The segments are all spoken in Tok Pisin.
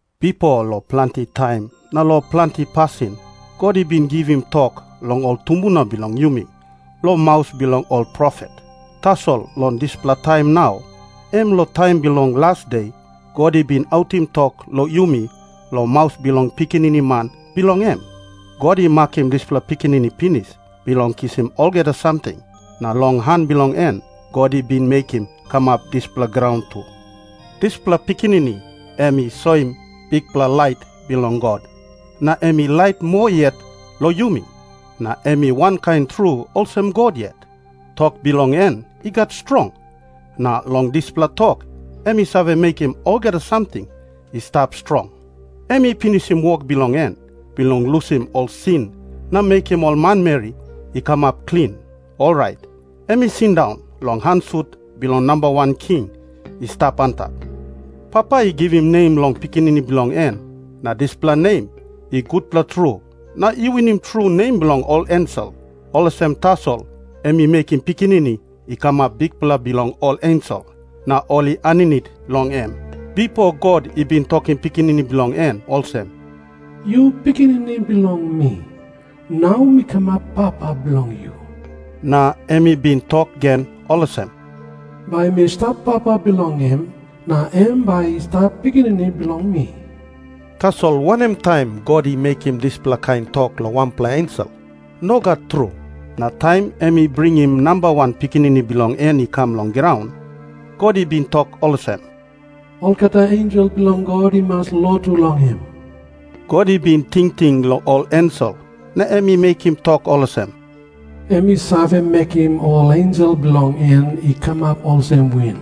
Bipo long planti taim na long planti pasin God i bin givim tok long ol tumbuna bilong yumi long maus bilong ol profet. Tasol long dispela taim nau, em long taim bilong las de, God i bin autim tok long yumi long maus bilong Pikinini Man bilong em. God i makim dispela Pikinini pinis bilong kisim olgeta samting, na long han bilong en God i bin mekim kamap dispela graun tu. Dispela Pikinini em i soim bikpela lait bilong God na em i lait moa yet long yumi, na em i wankain tru olsem God yet. Tok bilong en i gat strong, na long dispela tok em i save mekim olgeta samting i stap strong. Em i pinisim wok bilong en bilong lusim ol sin na mekim ol manmeri i kamap klin, orait em i sindaun long han sut bilong Namba Wan King i stap antap. Papa i givim nem long Pikinini bilong en, na dispela nem i gutpela tru na i winim tru nem bilong ol ensel. Olsem tasol em i mekim Pikinini i kamap Bikpela bilong ol ensel, na ol i aninit long em. Bipo God i bin tokim Pikinini bilong en olsem, "Yu pikinini bilong mi. Nau mi kamap papa bilong yu." Na em i bin tok gen olsem, "Bai mi stap papa bilong em, na em bai i stap pikinini bilong mi." Tasol wanem taim God i mekim dispela kain tok long wanpela ensel? Nogat tru. Na taim em i bringim namba wan Pikinini bilong en i kam long graun, God I bin tok olsem, "Olgeta ensel bilong God i mas lotu long em." God i bin tingting long ol ensel na em i mekim tok olsem, "Em i save mekim ol ensel bilong en i kamap olsem win.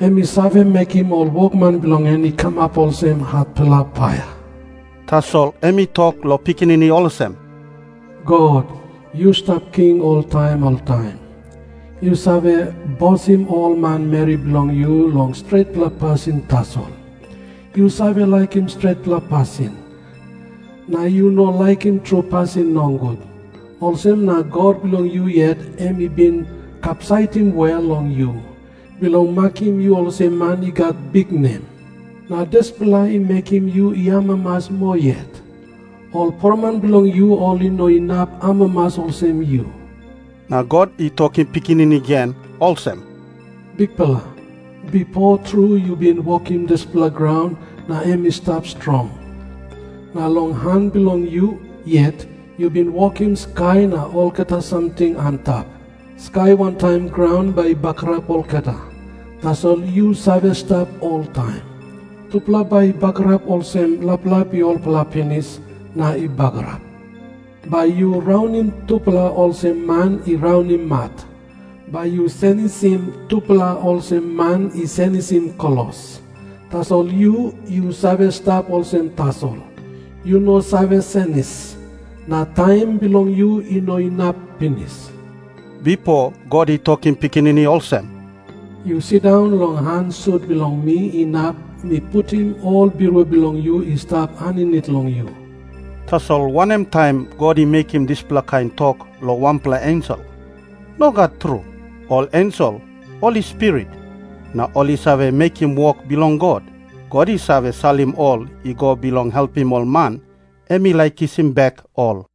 Em i save mekim ol wokman bilong en i kamap olsem hatpela paia." Tasol em i tok long Pikinini olsem, "God, yu stap king oltaim oltaim. Yu save bosim ol manmeri bilong yu long stretpela pasin tasol. Yu save laikim stretpela pasin, na yu no laikim tru pasin nogut. Olsem na God bilong yu yet em i bin kapsaitim wel long yu, bilong makim yu olsem man i gat biknem. Na dispela i mekim yu i amamas moa yet. Ol poroman bilong yu ol i no inap amamas olsem yu." Na God i tokim Pikinini gen olsem, "Bikpela, bipo tru yu bin wokim dispela graun na em i stap strong. Na long han bilong yu yet yu bin wokim skai na olgeta samting antap. Skai wantaim graun bai i bagarap olgeta, tasol yu save stap oltaim. Tupela bai i bagarap olsem laplap i olpela pinis na i bagarap. Bai yu raunim tupela olsem man i raunim mat. Bai yu senisim tupela olsem man i senisim klos. Tasol yu, yu save stap olsem tasol. Yu no save senis. Na taim bilong yu i no inap pinis." Bipo God i tokim Pikinini olsem, "Yu sindaun long han sut bilong mi inap mi putim ol birua bilong yu i stap aninit long yu." Tasol wanem taim God i mekim dispela kain tok long wanpela ensel? Nogat tru. Ol ensel ol i spirit, na ol i save mekim wok bilong God. God i save salim ol i go bilong helpim ol man em i laik kisim bek ol.